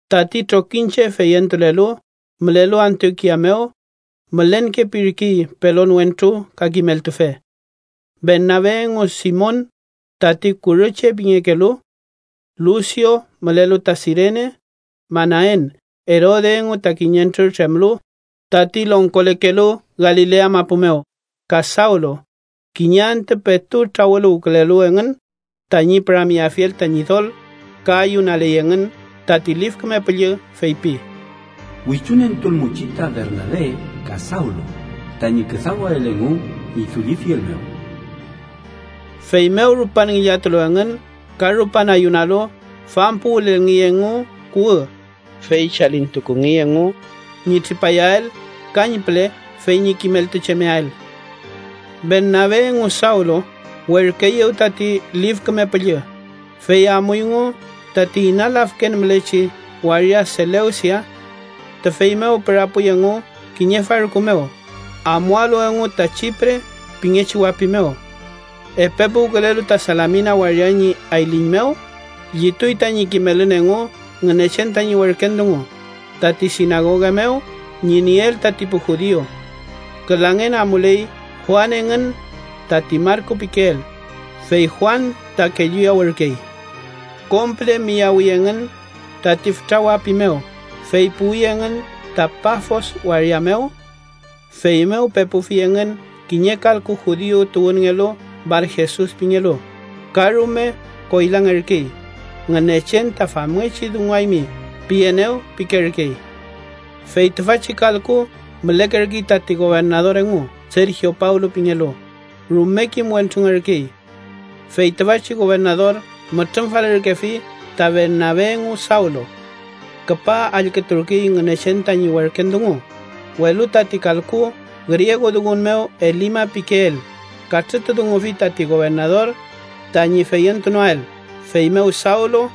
Tati trokiñche feyentulelu mülelu Antiokia mew mülenkepirkey pelon wentru ka kimeltufe. Bernabe engu, Simon (tati kurü che pingekelu), Lusio mülelu ta Sirene, Manaen (Erode engu ta kiñentrür tremlu, tati longkolekelu Galilea mapu mew) ka Sawlu. Kiñe antü, petu trawüluwkülelu engün tañi püramyeafiel ta Ñidol ka ayunaley engün, tati Lif Küme Püllü, feypi: “Wichunentulmuchi ta Bernabe ka Sawlu tañi küdawael engu ñi dullifiel mew.” Feymew rupan ngillatulu engün ka rupan ayunalu, fampuwülelngey engu kuwü, fey chalikünungey engu ñi tripayael kañpüle fey ñi kimeltuchemeael. Bernabe engu Sawlu werküeyew tati Lif Küme Püllü, fey amuyngu tati ina lafken mülechi waria Selewsia. Tüfey mew pürapuy engu kiñe farku mew, amualu engu ta Chipre pingechi wapi mew. Epe puwkülelu ta Salamina waria ñi ayliñ mew, llituy tañi kimelün engu Ngünechen tañi werken dungu, tati sinagoga mew ñi nieel tati pu judiu. Külangen amuley Juan engün tati Marku pikeel, fey Juan ta kelluyawürkey. Kom püle miyawi engün tati fütra wapi mew, fey puwi engün ta Pafos waria mew. Feymew pepufi engün kiñe kalku judiu tuwünngelu Barjesus pingelu, ka rume koylangerkey, “Ngünechen ta ‘famngechi dunguaymi’ pienew” pikerkey. Fey tüfachi kalku mülekerkey tati gobernador engu Sergio Pawlu pingelu, rume kim wentrungerkey. Fey tüfachi gobernador mütrümfalürkefi ta Bernabe engu Sawlu. Küpa allküturkey Ngünechen tañi werken dungu, welu tati kalku, griegudungun mew Elima pikeel, katrütudungufi tati gobernador tañi feyentunoael. Feymew Sawlu,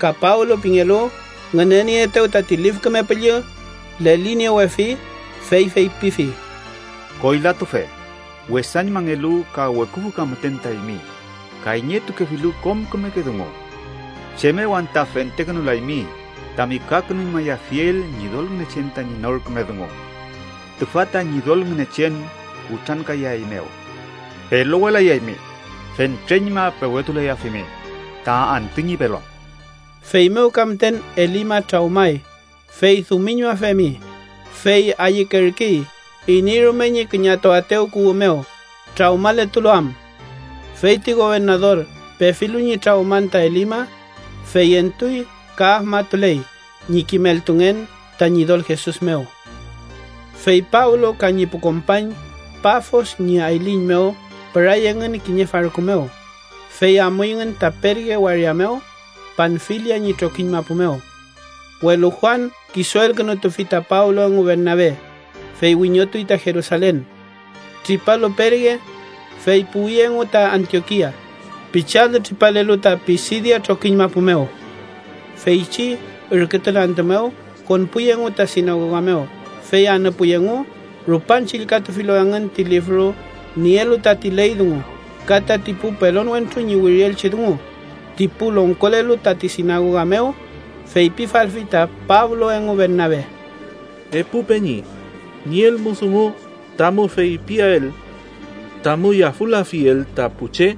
ka Pablo pingelu, ngünenieetew tati Lif Küme Püllü leliniewefi, fey feypifi: —¡Koylatufe, wesañmangelu ka weküfü ka müten ta eymi, kayñetukefilu kom kümeke dungu! ¿Chem mew anta fentekünulaymi tami kakünuñmayafiel Ñidol Ngünechen tañi nor küme dungu? Tüfa ta Ñidol Ngünechen kutrankayaeymew: pelowelayaymi, fentreñma pewetulayafimi ta antü ñi pelon. Feymew ka müten Elima trawmay, fey dumiñmafemi, fey ayükerkey iney rume ñi küñatuaetew kuwü mew, trawmaletulu am. Fey ti gobernador pefilu ñi trawman ta Elima, feyentuy ka afmatuley ñi kimeltungen ta Ñidol Jesus mew. Fey Pablo ka ñi pu kompañ Pafos ñi ayliñ mew püray engün kiñe farku mew, fey amuyngün ta Perge waria mew, Panfilia ñi trokiñ mapu mew. Welu Juan kisuelkünutufi ta Pablo engu Bernabe, fey wiñotuy ta Jerusalen. Tripalu Perge, fey puwi engu ta Antiokia, pichi alü tripalelu ta Pisidia trokiñ mapu mew. Feychi ürkütun antü mew, konpuy engu ta sinagoga mew, fey anüpuy engu. Rupan chillkatufilu engün ti lifru nielu tati ley dungu ka tati pu pelon wentru ñi wirielchi dungu, ti pu longkolelu tati sinagoga mew feypifalfi ta Pablo engu Bernabe: —Epu peñi, nielmu dungu tamu feypiael tamu yafülafiel ta pu che,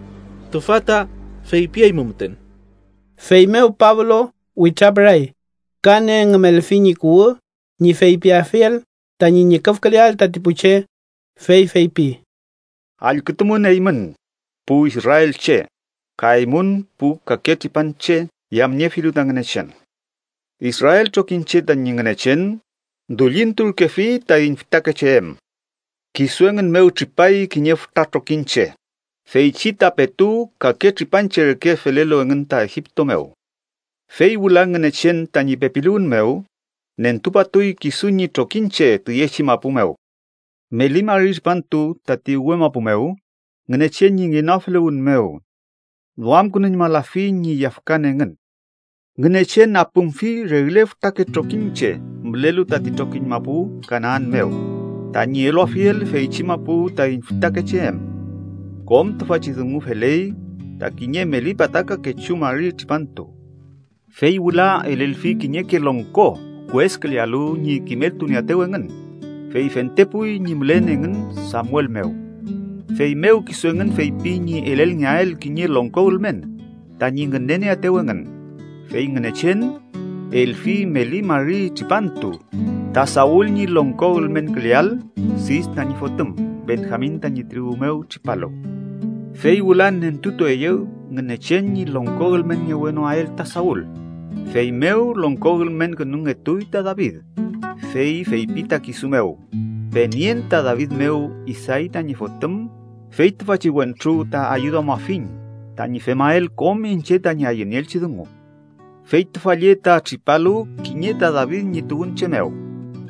tüfa ta feypiaymu müten. Feymew Pablo witrapüray, ka nengümelfi ñi kuwü ñi feypiafiel tañi ñüküfküleael tati pu che, fey feypi: —Allkütumün eymün, pu israelche, ka eymün, pu kake tripanche yamniefilu ta Ngünechen. Israel trokiñche tañi Ngünechen dullinturkefi taiñ fütakeche em. Kisu engün mew tripay kiñe fütra trokiñche feychi ta petu kake tripanche reke felelu engün ta Egipto mew. Fey wüla, Ngünechen tañi pepiluwün mew, nentupatuy kisu ñi trokiñche tüyechi mapu mew. Meli mari tripantu tati uwe mapu mew Ngünechen ñi ngenoafeluwün mew duamkünuñmalafi ñi yafkan engün. Ngünechen apümfi regle fütrake trokiñche mülelu tati trokiñ mapu Kanaan mew, tañi eluafiel feychi mapu taiñ fütakeche em. Kom tüfachi dungu feley ta kiñe meli pataka kechu mari tripantu. “Fey wüla elelfi kiñeke longko kueskülealu ñi kimeltunieaetew engün, fey fentepuy ñi mülen engün Samuel mew. Feymew kisu engün feypi ñi elelngeael kiñe longko ülmen tañi ngünenieaetew engün, fey Ngünechen, elfi meli mari tripantu ta Saul ñi longko ülmenküleael, Sis tañi fotüm, Benjamin tañi tribu mew tripalu. Fey wüla nentutueyew Ngünechen ñi longko ülmenngewenoael ta Saul, feymew longko ülmenkünungetuy ta David, fey feypi ta kisu mew: ‘Penien ta David mew Isay tañi fotüm, fey tüfachi wentru ta ayüduamafiñ tañi femael kom iñche tañi ayünieelchi dungu.’ Fey tüfa lle ta tripalu kiñe ta David ñi tuwünche mew,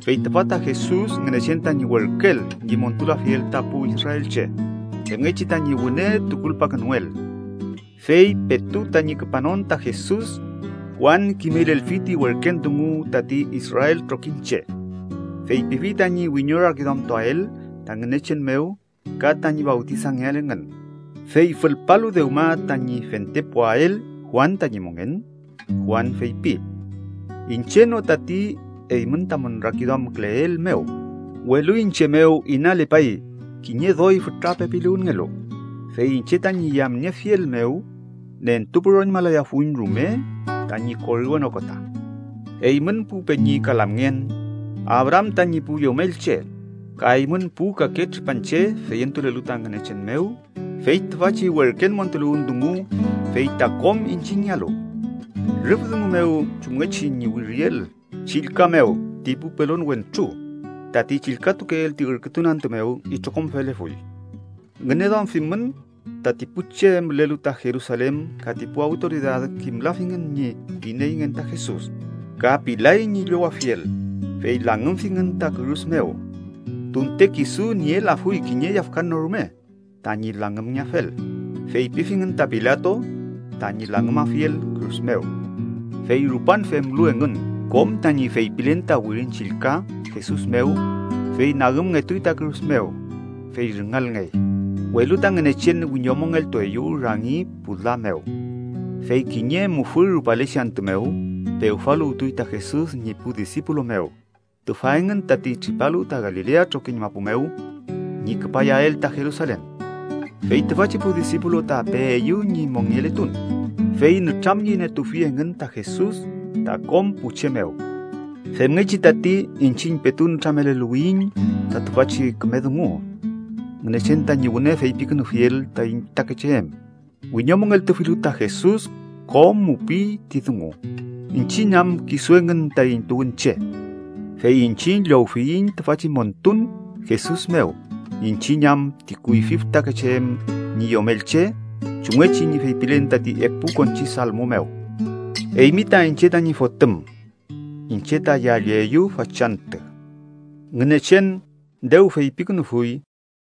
fey tüfa ta Jesus Ngünechen tañi werküel ñi montulafiel ta pu israelche, femngechi tañi wüne tukulpakünuel. Fey petu tañi küpanon ta Jesus, Juan kimelelfi ti werken dungu tati Israel trokiñche. Feypifi tañi wiñorakiduamtuael ta Ngünechen mew ka tañi fawtisangeael engün. Fey fülpalu dewma tañi fentepuael Juan tañi mongen, Juan feypi: ‘Iñche no tati eymün tamün rakiduamküleel mew, welu iñche mew inalepay kiñe doy fütra pepiluwünngelu, fey iñche tañi yamniefiel mew nentupüroñmalayafuiñ rume tañi koriwen okota.’ “Eymün pu peñi ka lamngen, Abraam tañi pu yomelche, ka eymün pu kake tripanche feyentulelu ta Ngünechen mew: fey tüfachi werken montuluwün dungu fey ta kom iñchiñngealu. Rüf dungu mew chumngechi ñi wiriel Chillka mew ti pu pelon wentru tati chillkatukeel ti ürkütun antü mew itrokom felefuy. Ngüneduamfimün tati pu che mülelu ta Jerusalen ka ti pu awtoridad kimlafingün ñi ineyngen ta Jesus, ka pilay ñi llowafiel, fey langümfingün ta kürus mew. Tunte kisu nielafuy kiñe yafkan no rume tañi langümngeafel, feypifingün ta Pilato tañi langümafiel kürus mew. Fey rupan femlu engün kom tañi feypilen ta Wirin Chillka Jesus mew, fey nagümngetuy ta kürus mew, fey rüngalngey. Welu ta Ngünechen wiñomongeltueyew rangi pu la mew. Fey kiñe mufü rupalechi antü mew pewfaluwtuy ta Jesus ñi pu disipulu mew tüfa engün tati tripalu ta Galilea trokiñ mapu mew ñi küpayael ta Jerusalen. Fey tüfachi pu disipulu ta peeyew ñi mongeletun, fey nütramyenietufi engün ta Jesus ta kom pu che mew. “Femngechi tati iñchiñ petu nütrameluwiyiñ ta tüfachi küme dungu: Ngünechen tañi wüne feypikünufiel taiñ fütakeche em, wiñomongeltufilu ta Jesus kom mupiy ti dungu, iñchiñ am kisu engün taiñ tuwünche. Fey iñchiñ llowfiyiñ tüfachi montun Jesus mew iñchiñ am ti kuyfi fütakeche em ñi yomelche chumngechi ñi feypilen tati epu konchi salmo mew: ‘Eymi ta iñche tañi fotüm. Iñche ta yalleyu fachantü.’ Ngünechen dew feypikünufuy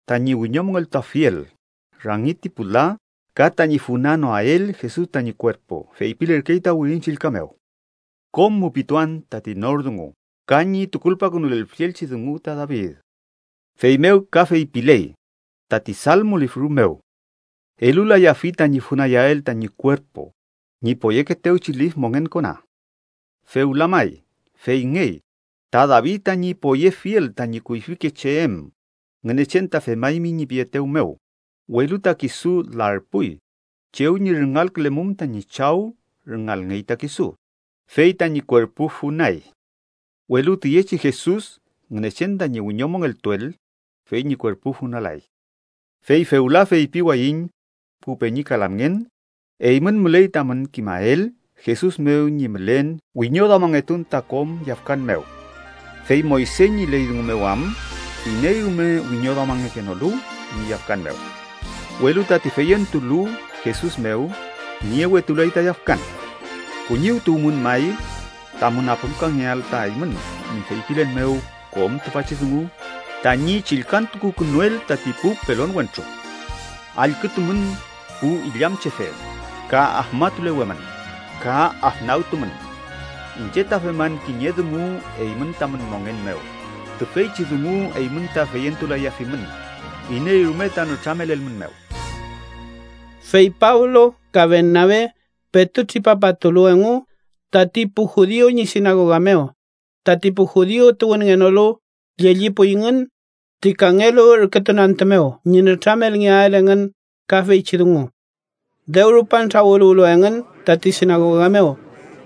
tañi wiñomongeltuafiel rangi ti pu la ka tañi funanoael Jesus tañi kuerpu, feypilerkey ta Wirin Chillka mew: ‘Kom mupituan tati nor dungu ka ñi tukulpakünulelfielchi dungu ta David.’ Feymew ka feypiley tati Salmo lifru mew: ‘Elulayafi tañi funayael tañi kuerpu ñi poyekeetewchi lif mongen kona.’ “Fewla may, feyngey, ta David tañi poyefiel tañi kuyfike che em, Ngünechen ta femaymi ñi pietew mew, ‘welu ta kisu larpuy chew ñi rüngalkülemum tañi chaw rüngalngey ta kisu’, fey tañi kuerpu funay. Welu tüyechi Jesus Ngünechen tañi wiñomongeltuel, fey ñi kuerpu funalay. “Fey fewla feypiwayiñ, pu peñi ka lamngen, eymün müley tamün kimael Jesus mew ñi mülen wiñoduamangetun ta kom yafkan mew. Fey Moyse ñi ley dungu mew am iney rume wiñoduamangekenolu ñi yafkan mew, welu tati feyentulu Jesus mew niewetulay ta yafkan. Kuñiwtukuymün may tamün apümkangeael ta eymün ñi feypilen mew kom tüfachi dungu tañi chillkantukukünuel tati pu pelon wentru: ‘Allkütumün pu illamchefe, ka afmatulewemün, ka afnagtumün. Iñche ta feman kiñe dungu eymün tamün mongen mew, tüfeychi dungu eymün ta feyentulayafimün, iney rume ta nütramelelmünmew.’” Fey Pablo ka Bernabe petu tripapatulu engu tati pu judiu ñi sinagoga mew, tati pu judiu tuwünngenolu llellipuyngün ti kangelu ürkütun antü mew ñi nütramelngeael engün ka feychi dungu. Dew rupan trawüluwlu engün tati sinagoga mew,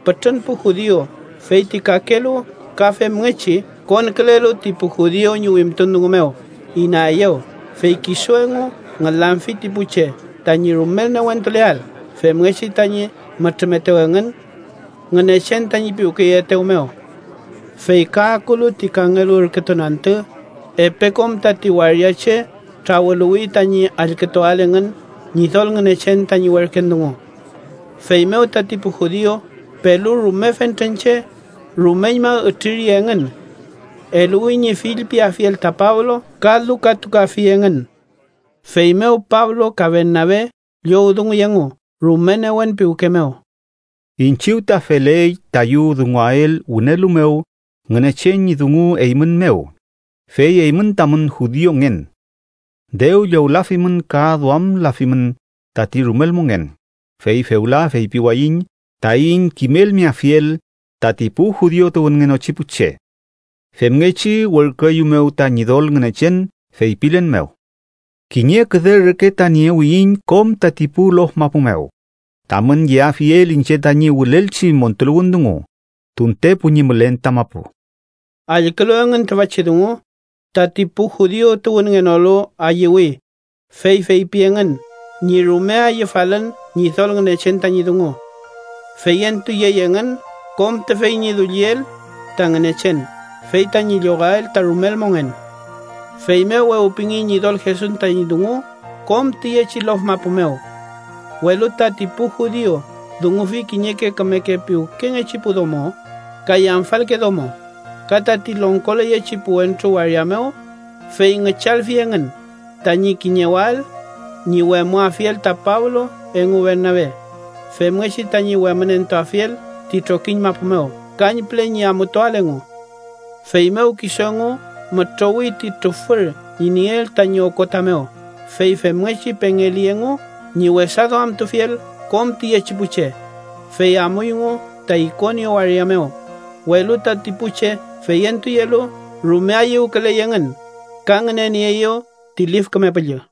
pütrün pu judiu, fey ti kakelu ka femngechi konkülelu ti pu judiu ñi wimtun dungu mew, inaeyew. Fey kisu engu ngülamfi ti pu che tañi rumel newentuleael, femngechi tañi mütrümetew engün Ngünechen tañi piwkeyeetew mew. Fey ka akulu ti kangelu ürkütun antü, epe kom tati waria che trawüluwi tañi allkütuael engün Ñidol Ngünechen tañi werken dungu. Feymew tati pu judiu pelu rume fentren che, rumeñma ütriri engün. Eluwi ñi fillpiafiel ta Pablo ka lukatukafi engün. Feymew Pablo ka Bernabe, llowdunguy engu rume newen piwke mew: —Iñchiw ta feley tayu dunguael wünelu mew Ngünechen ñi dungu eymün mew, fey eymün tamün judiungen. Dew llowlafimün ka duamlafimün tati rumel mongen, fey fewla feypiwayiñ taiñ kimelmeafiel tati pu judiu tuwünngenochi pu che. Femngechi werküeyumew ta Ñidol Ngünechen feypilen mew: ‘Kiñe küde reke ta niewiyiñ kom tati pu lof mapu mew, tamün yeafiel iñche tañi wülelchi montuluwün dungu, tuntepu ñi mülen ta mapu.’ Allkülu engün tüfachi dungu, tati pu judiu tuwünngenolu ayüwi, fey feypi engün ñi rume ayüfalün Ñidol Ngünechen tañi dungu. Feyentuyey engün kom tüfey ñi dulliel ta Ngünechen, fey tañi llowael ta rumel mongen. Feymew wewpingey Ñidol Jesus tañi dungu kom tiyechi lof mapu mew. Welu tati pu judiu dungufi kiñeke kümeke piwkengechi pu domo ka yamfalke domo, ka tati longkoleyechi pu wentru waria mew, fey ngüchalfi engün tañi kiñewael ñi wemüafiel ta Pablo engu Bernabe, femngechi tañi wemünentuafiel ti trokiñ mapu mew, kañpüle ñi amutuael engu. Feymew kisu engu mütrowi ti trufür ñi nieel tañi okota mew, fey femngechi pengeli engu ñi wesaduamtufiel kom tiyechi pu che, fey amuyngu ta Ikonio waria mew. Welu tati pu che feyentuyelu, rume ayüwküley engün ka ngünenieeyew ti Lif Küme Püllü.